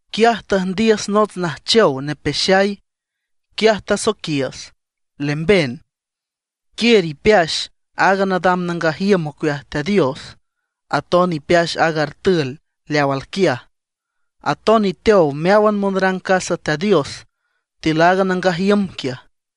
Quiaj tüjndiüs nots najchow nepeaxay. Quiaj tasoiquiüs: ―Lemben, quiür ipeax aaga nadam nangaj iüm ocueaj Teat Dios, aton ipeax aaga artül leaw alquiaj. Aton iteow meáwan monrang casa Teat Dios tiül aaga nangaj iüm quiaj.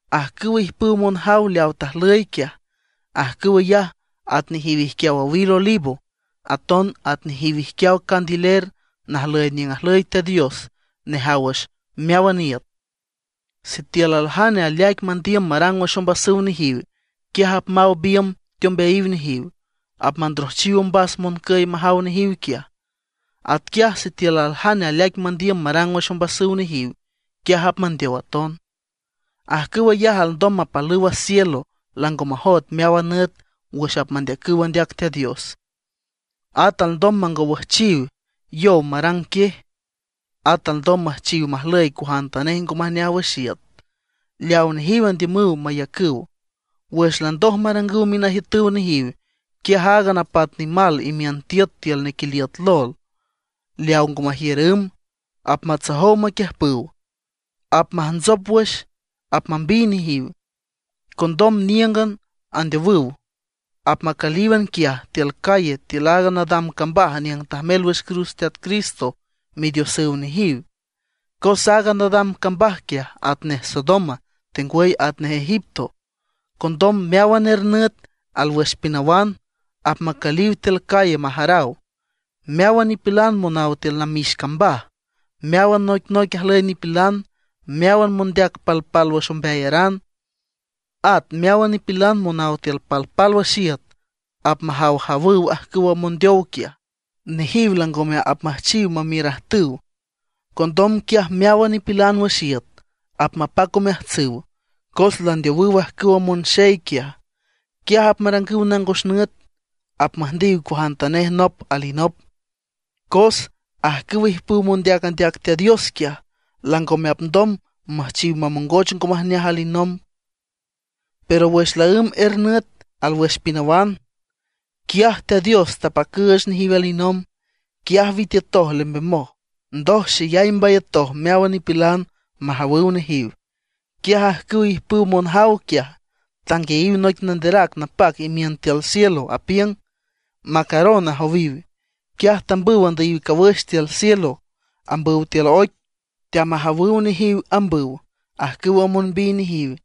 Ajcüwa ijpüw monjaw leaw tajlüy quiaj, ajcüw ayaj at nejiw ijquiaw owil olivo, aton at nejiw ijquiaw candiler najlüy niüng ajlüy Teat Dios nejaw wüx meáwan iüt. Sitiül aljane aleaic mandiüm marang wüx ombasüw nejiw, quiaj apmaw biümb teombeayiw nejiw, apmandrojchiw ombas moncüy majaw nejiw quiaj. Atquiaj sitiül aljane aleaic mandiüm marang wüx ombasüw nejiw, quiaj apmandeow aton. Ajcüw ayaj alndom mapalüw a cielo lango majoet meáwan nüt wüx apmandeacüw andeac Teat Dios. At alndom mangowüjchiw yow marang quiej. At alndom müjchiw majlüy cuajantanej ngo majneaj wüx iüt, leawa nejiw andiümüw mayacüw. Wüx landoj marangüw minajiütüw nejiw, quiaj aaga napat nimal imiün tiüt tiül nequiliüt lol leaw ngo majiür ümb, apmatsojow maquiüjpüw, apmantsop wüx, apmambiy nejiw. Condom níüngan andeowüw, apmacülíwan quiaj tiül calle tiül aaga nadam cambaj niüng tajmel wüx cruz Teat Cristo Midiosüw nejiw. Cos aaga nadam cambaj quiaj atnej Sodoma, tengwüy atnej Egipto. Condom meáwan er nüt alwüx pinawan, apmacüliw tiül calle majaraw. Meáwan nipilan monaw tiül namix cambaj, meáwan noicnoic ajlüy nipilan, meáwan mondeac palpálwüx ombeayaran, at meáwan nipilan monaw tiül palpálwüx iüt apmajawjawüw ajcüwa mondeow quiaj. Nejiw langome apmüjchiw mamiürajtüw. Condom quiaj meáwan nipilan wüx iüt apmapac omeajtsüw, cos landeowüw ajcüwa monxey quiaj. Quiaj apmarangüw nangos nüt, apmüjndiw cuajantanej nop alinop, cos ajcüw ijpüw mondeac andeac Teat Dios quiaj, langome apndom müjchiw mamongoch ngo majneaj alinomb. Pero wüx laǘmb er nüt alwüx pinawan, quiaj Teat Dios tapacüüch nejiw alinomb. Quiaj witiütoj lembemoj. Ndoj xeyay mbayatoj meáwan nipilan majawüw nejiw. Quiaj ajcüwa ijpüw monjaw quiaj tanguiayiw noic nanderac napac imiün tiül cielo, apiüng: ―Macaron ―ajowiw. Quiaj tambüw andüyiw cawüx tiül cielo, ambüw tiül oic, teamajawüw nejiw ambüw ajcüwa monbiy nejiw.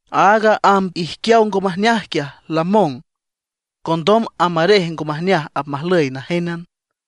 Aaga amb ijquiaw ngo majneaj quiaj, lamong. Condom amb arej ngo majneaj apmajlüy najénan.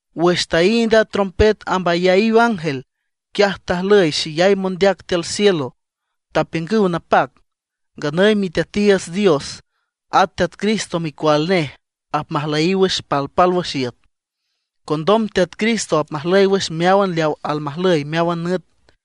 Wüx taínd a trompet amb ayaíw ángel, quiaj tajlüy xeyay mondeac tiül cielo, tapiüngüw napac: Nganüy Miteatiiüts Dios, at Teat Cristo micual nej apmajlüyiw wüx palpálwüx iüt; condom Teat Cristo apmajlüy wüx meáwan leaw almajlüy meáwan nüt.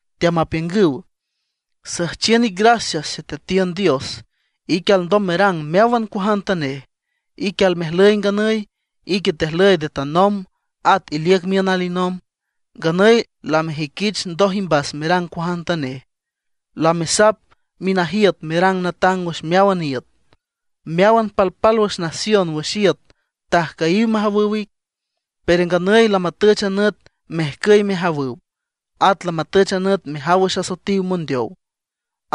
Teamapiüngüw: Süjchiün ic gracias Xeteatiün Dios, ique alndom merang meáwan cuajantanej, ique almejlüy nganüy, ique tejlüy nde tanomb, at iliüc miün alinomb. Nganüy lamejüiquich ndoj imbas merang cuajantanej; lamesap minajiüt merang natang wüx meáwan iüt. Meáwan palpálwüx nación wüx iüt tajcüyiw majawüw ic, pero nganüy lamatüch a nüt mejcüy mejawüw. At lamatüch a nüt mejaw wüx asoetiw mondeow,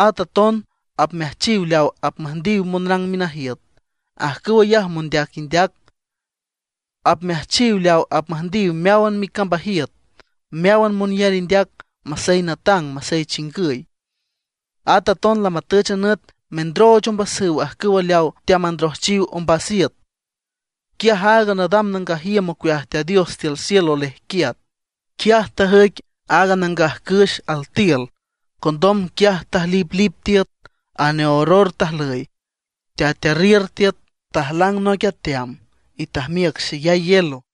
at aton apmeajchiw leaw apmüjndiw monrang minajiüt, ajcüw ayaj mondeac indeac. Apmeajchiw leaw apmüjndiw meáwan micambajiüt, meáwan monyar indeac, masey natang, masey chingüy. At aton lamatüch a nüt mendrooch ombasüw ajcüw leawa teamandrojchiw ombas iüt. Quiaj aaga nadam nangaj iüm ocueaj Teat Dios tiül cielo lejquiat. Quiaj tajüic aaga nangaj cüx altiül. Condom quiaj tajliplip tiüt, aneorror tajlüy, tetearriür tiüt, tajlang noic ateam, y tajmiüc xeyay hielo.